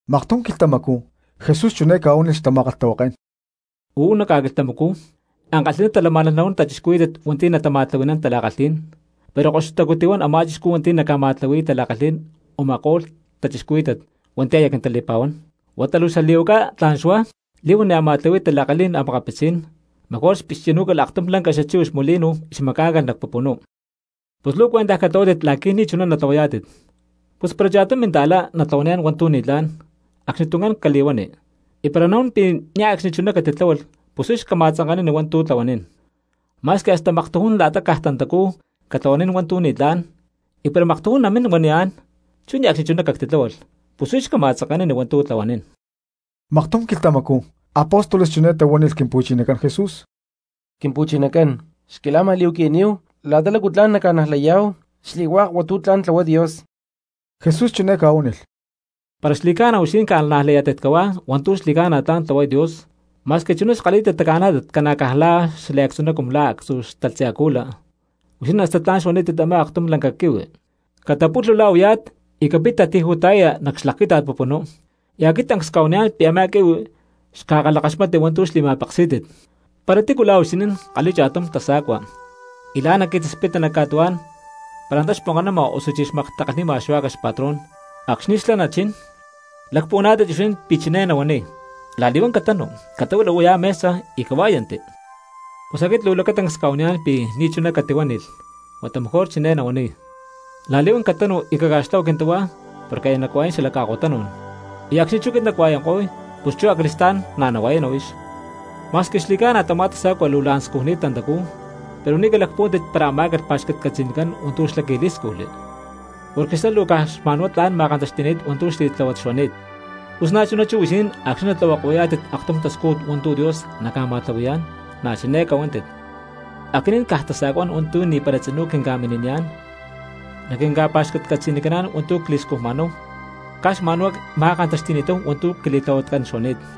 Maktum quilhtamacú Jesús chiné ca̠huánilh xtama̠kalhtahuaké̠n: —Uú nac ca̠quilhtamacú ankalhi̠ná talamá̠nalh nahuán cristianos hua̠nti̠ natama̠tlahui̠nán tala̠kalhí̠n, pero koxutacú tihuán a̠má chixcú hua̠nti̠ naca̠ma̠tlahui̠y tala̠kalhí̠n u̠ma̠ko̠lh cristianos hua̠nti̠ aya quintali̠pa̠huán. Huata luu xali̠huaca tla̠n xuá li̠huán ni̠ a̠ ma̠tlahui̠y tala̠kalhi̠n xta̠cristianos, mejor xpixchi̠nú̠calh aktum lanca xachíhuix molino y xmacá̠ncalh nac pupunú. ¡Pus luu cuentaj catlahuátit la̠qui̠ ni̠chuná natlahuayá̠tit! ’Pus para cha̠tum cristiano natlahuaniyá̠n hua̠ntu̠ ni̠tlá̠n, acxnituncán cali̠huani; y para nahuán pi̠ niaj ne̠cxni chuná catitláhualh pus huix cama̠tzanke̠nani hua̠ntu̠ tlahuanín. Ma̠squi hasta maktujún la̠ta caj tantacú catlahuanín hua̠ntu̠ ni̠tlá̠n, y para maktujún naminá̠n huaniyá̠n: “Chú niaj ne̠cxni chuná cactitláhualh”, huix cama̠tzanke̠nani hua̠ntu̠ tlahuanín. Maktum quilhtamacú apóstoles chiné tahuánilh Quimpu̠chinacán Jesús: —Quimpu̠chinacán, xquila̠ma̠li̠huaqui̠níhu la̠ta lácu tla̠n nacca̠najlayá̠hu xli̠hua̠k hua̠ntu̠ tla̠n tlahuay Dios. Jesús chiné ca̠huánilh: —Para xli̠ca̠na huixinín ca̠najlayá̠tit cahuá hua̠ntu̠ xli̠ca̠na tla̠n tlahuay Dios, ma̠squi chuná xkalhí̠tit taca̠nájlat ca̠na caj la̠ xliactzuná cumu la̠ actzú xatalhtzi acúla, huixinín hasta tla̠n xuanítit a̠má akatum lanca quihui: “Catapulhu la̠ u̠yá̠t y capit tati̠ju̠ta̠yaya nac xlaquíta̠t pupunú”, y aquit tancs cca̠huaniyá̠n pi̠ a̠má quihui xca̠kalhakaxmatni hua̠ntu̠ xli̠ma̠peksí̠tit. ’Para tícu la̠ huixinín kalhi̠y cha̠tum tasa̠cua y la̠ naqui̠taspita nac ca̠tuhuá̠n para antá xponkanama osuchí xmaktakalhnima xuá̠cax xpatrón, acxni̠ xlá nachín, ¿lacpuhuaná̠tit huixinín pi̠ chiné nahuaniy: “La̠li̠huán catanu, catahuila la̠ u̠yá mesa y cahuá̠yanti”? Pus aquit luu lacatancs cca̠huaniyá̠n pi̠ ni̠chuná catihuánilh, huata mejor chiné nahuaniy: “La̠li̠huán catanu y caca̠xtlahua quintahuá porque aya nacua̠yán xala ca̠ko̠tanú̠n, y acxni̠ chú aquit nacua̠yanko̠y pus chú acali̠stá̠n na̠ nahua̠yana huix.” Ma̠squi xli̠ca̠na tamá tasa̠cua luu la̠n scujni̠t tantacú, pero ni̠ calacpuhuántit para amá̠calh pa̠xcatcatzi̠nicán hua̠ntu̠ xlá qui̠lí̠scujli, porque xlá luu caj xma̠nhuá tlán ma̠kantaxti̠ni̠t hua̠ntu̠ xli̠tláhuat xuani̠t. Pus na̠chuná chú huixinín acxni̠ natlahuako̠yá̠tit aktum tascújut hua̠ntu̠ Dios naca̠ma̠tlahui̠yá̠n na̠ chiné cahuántit: “Aquinín caj tasa̠cuá̠n hua̠nti̠ ni̠para tzinú quinca̠mini̠niyá̠n naquinca̠pa̠xcatcatzi̠nicaná̠n hua̠ntu̠ cli̠scujma̠náhu, caj xma̠nhuá cma̠kantaxti̠ni̠táhu hua̠ntu̠ quili̠tlahuatcán xuani̠t.”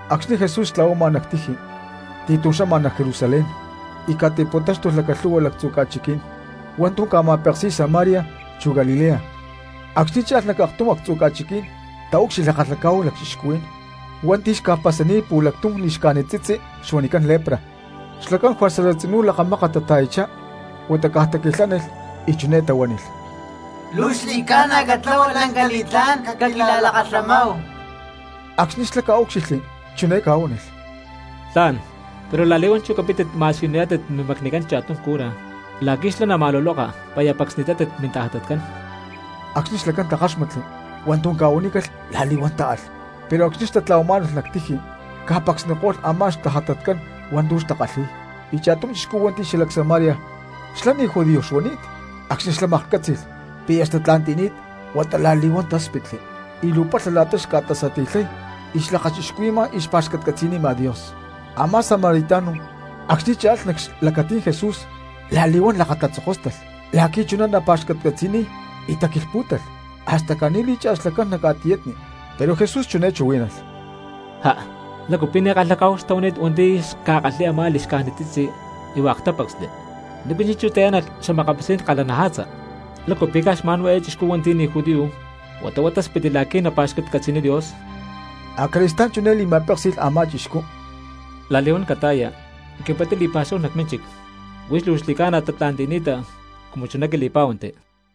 Acxni̠ Jesús xtla̠huama nac tiji ti̠tum xama nac Jerusalén, y ca̠ti̠puntáxtulh lacalhu̠hua lactzu̠ ca̠chiquí̠n hua̠ntu̠ ca̠ma̠peksi̠y Samaria chu Galilea. Acxni̠ cha̠lh nac aktum actzu̠ ca̠chiquí̠n taúcxilhli kalhacá̠hu lacchixcuhuí̠n hua̠nti̠ xca̠pasani̠t pu̠lactum li̠xcájnit tzitzi huanicán lepra, xlacán juerza tzinú lakamákat tata̠yachá. Huata caj taquilhánilh y chiné tahuánilh: —¡Luu xli̠ca̠na catlahua lanca li̠tlá̠n caquila̠lakalhamáhu! Acxni̠ xlá ca̠úcxilhli chiné ca̠huánilh: —Tla̠n, pero la̠li̠huán chú capítit ma̠siyuniyá̠tit mimacnicán cha̠tum cura la̠qui̠ xlá nama̠luloka pi̠ aya pacsni̠tátit mintajatatcán. Acxni̠ xlacán takáxmatli hua̠ntu̠ ca̠huanícalh la̠li̠huán táalh, pero acxni̠ xtatla̠huamá̠nalh nac tiji ca̠pacsniko̠lh a̠má xtajatatcán hua̠ntu̠ xca̠kalhi̠y. Y cha̠tum chixcú hua̠nti̠ xalac Samaria xlá ni̠ judío xuani̠t, acxni̠ xlá maklhcátzi̠lh pi̠ aya xtatla̠nti̠ni̠t huata la̠li̠huán talákspitli y luu palha la̠ta xca̠tasati̠lhay xlakachixcuhui̠ma y xpa̠xcatcatzi̠nima Dios. Amá samaritano acxni̠ cha̠lh nac xlacatí̠n Jesús la̠li̠huán lakatatzokóstalh la̠qui̠ chuná napa̠xcatcatzi̠niy y taquilhpú̠talh hasta caní lí̠cha̠lh xlacán nac ca̠tiyatni. Pero Jesús chiné chuhuí̠nalh: —¿Ja, lácu pi̠ ni̠ kalhacá̠hu xtahuani̠t hua̠nti̠ xca̠kalhi̠y a̠má li̠xcájnit tzitzi y hua̠k tápacsli? ¿Nícu chi̠nchú tayá̠nalh xa̠makapitzí̠n kalhanaja̠tza? ¿Lácu pi̠ caj xma̠nhuá eé chixcú hua̠nti̠ ni̠ judío huata huá táspitli la̠qui̠ napa̠xcatcatzi̠niy Dios? Acali̠stá̠n chiné li̠ma̠péksi̠lh a̠má chixcú: —La̠li̠huán cata̠ya y capittá li̠pa̠xúhu nac mínchic. Huix luu xli̠ca̠na tatla̠nti̠ni̠ta cumu chuná quili̠pá̠huanti.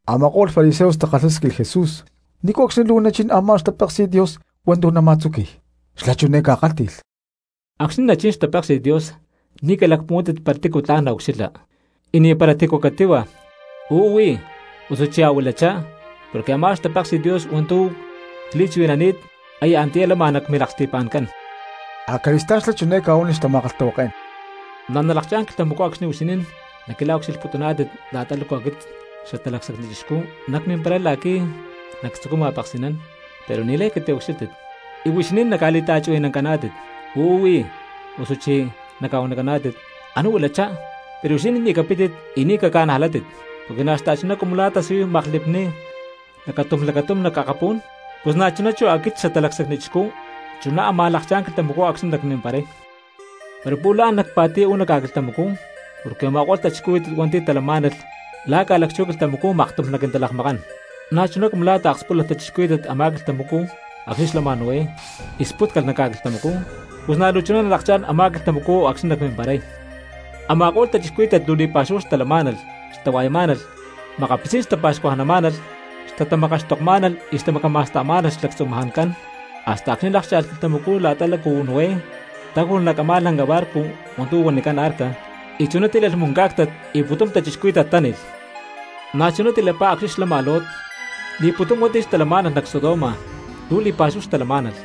Ama̠ko̠lh fariseos takalhásquilh Jesús nícu acxni̠ luu nachín a̠má xtapéksi̠t Dios hua̠ntu̠ nama̠tzuqui̠y. Xlá chiné ca̠kálhti̠lh: —Acxni̠ nachín xtapéksi̠t Dios ni̠ calacpuhuántit para tícu tla̠n naucxilha. Y ni̠para tícu catíhua: “Uú huí”, osuchí “Ahuilachá”; porque a̠má xtapéksi̠t Dios hua̠ntu̠ cli̠chuhui̠nani̠t aya antiyá lama nac milaksti̠pa̠ncán. Acali̠stá̠n xlá chiné ca̠huánilh xtama̠kalhtahuaké̠n: —Na̠ nalakchá̠n quilhtamacú acxni̠ huixinín naucxilhputuná̠tit la̠ta lácu aquit Xatalacsacni Chixcú nacmimparay la̠qui̠ nactzucuy ma̠peksi̠nán, pero ni̠lay catiucxílhtit. Y huixinín naca̠li̠ta̠chuhui̠nancaná̠tit: “Uú huí”, osuchí naca̠huanicaná̠tit: “Anú huilachá.” Pero huixinín ni̠ capítit y ni̠ caca̠najlátit. Porque na̠ xta̠chuná cumu la̠ tasiyuy maklipni lacatum lacatúm nac akapú̠n, pus na̠chuná chú aquit Xatalacsacni Chixcú chuná ámaj lakchá̠n quilhtamacú acxni̠ nacmimparay. Pero pu̠lh la̠n nacpa̠ti̠y uú nac ca̠quilhtamacú, porque u̠ma̠ko̠lh cristianos hua̠nti̠ talamá̠nalh la̠ ca̠lacchú quilhtamacú maktum naquintalakmakán. Na̠chuná cumu la̠ taakspúlalh cristianos a̠má quilhtamacú acxni̠ xlama Noé y spútcalh nac ca̠quilhtamacú, pus na̠ luu chuná nalakchá̠n a̠má quilhtamacú acxni̠ nacmimparay. Ama̠ko̠lh cristianos luu li̠pa̠xúhu xtalamá̠nalh, xtahua̠yamá̠nalh, makapitzí̠n xtapa̠xcuajnamá̠nalh, xtatamakaxtokmá̠nalh, y xtamacama̠sta̠má̠nalh xlactzumajancán, hasta acxni̠ lákcha̠lh quilhtamacú la̠ta lácu Noé táju̠lh nac a̠má lanca barco hua̠ntu̠ huanicán arca, y chuná tílalh muncá̠ctat y pu̠tum cristianos táni̠lh. Na̠chuná tilapá acxni̠ xlama Lot: li̠pu̠tum hua̠nti̠ xtalamá̠nalh nac Sodoma luu li̠pa̠xúhu xtalamá̠nalh,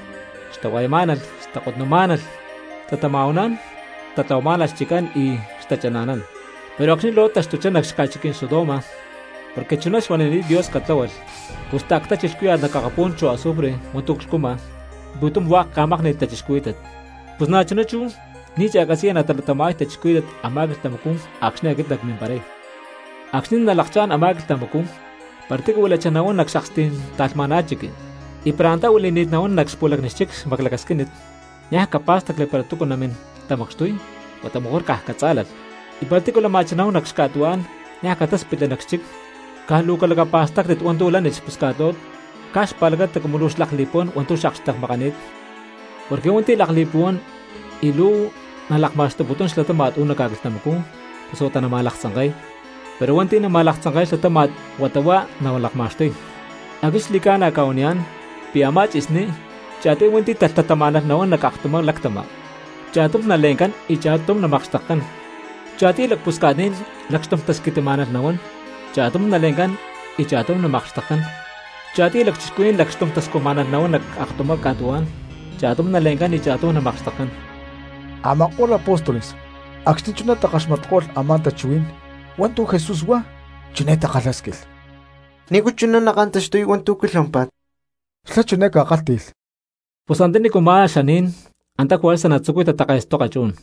xtahua̠yamá̠nalh, xtakotmá̠nalh, xtatama̠huanán, xtatlahuamá̠nalh xchiccán, y xtachana̠nán. Pero acxni̠ Lot taxtuchá nac xaca̠chiquí̠n Sodoma, porque chuná xuanini̠t Dios catláhualh, pus ta̠ctachi lhcúya̠t nac akapú̠n chu azufre hua̠ntu̠ clhcuma, y pu̠tum hua̠k ca̠mákni̠lh cristianos. Pus na̠chuná chú ni̠ cha̠catzi̠ya natalatama̠y cristianos a̠má quilhtamacú acxni̠ aquit nacmimparay. ’Acxni̠ nalakchá̠n a̠má quilhtamacú para tícu huilachá nahuán nac xakstí̠n ta̠lhma̠ná chiqui, y para antá huili̠ni̠t nahuán nac xpu̠lacni xchic xmaclacasquínit, niaj capá̠stacli para túcu namín tamacxtuy huata mejor caj catzá̠lalh; y para tícu lama̠chá nahuán nac ca̠tuhuá̠n niaj catáspitli nac xchic. Caj luu calacapa̠stáctit hua̠ntu̠ lánilh xpusca̠t Lot caj xpa̠lacata cumu xlakli̠puhuán hua̠ntu̠ xakxtekmakani̠t. Porque hua̠nti̠ lakli̠puhuán y luu nalakma̠xtuputún xlatáma̠t uú nac ca̠quilhtamacú pus huata nama̠laktzanke̠y, pero hua̠nti̠ nama̠laktzanke̠y xlatáma̠t huata huá nalakma̠xtuy. ’Aquit xli̠ca̠na cca̠huaniyá̠n pi̠ a̠má tzi̠sní cha̠tiy hua̠nti̠ talhtatamá̠nalh nahuán nac aktumá lactama, cha̠tum nale̠ncán y cha̠tum namakxtekcán. Cha̠tiy lacpusca̠tní̠n lacxtum tasquitimá̠nalh nahuán, cha̠tum nale̠ncán y cha̠tum namakxtekcán. Cha̠tiy lacchixcuhuí̠n lacxtum tascujmá̠nalh nahuán nac aktumá ca̠tuhuá̠n, cha̠tum nale̠ncán y cha̠tum namakxtekcán. Ama̠ko̠lh apóstoles acxni̠ chuná takaxmatko̠lh a̠má tachuhuí̠n hua̠ntu̠ Jesús huá, chiné takalhásquilh: —¿Nícu chuná nakantaxtuy hua̠ntu̠ quilhuámpa̠t? Xlá chiné ca̠kálhti̠lh: —Pus antanícu má xaní̠n, antá juerza natzucuy tatake̠stoka chu̠n.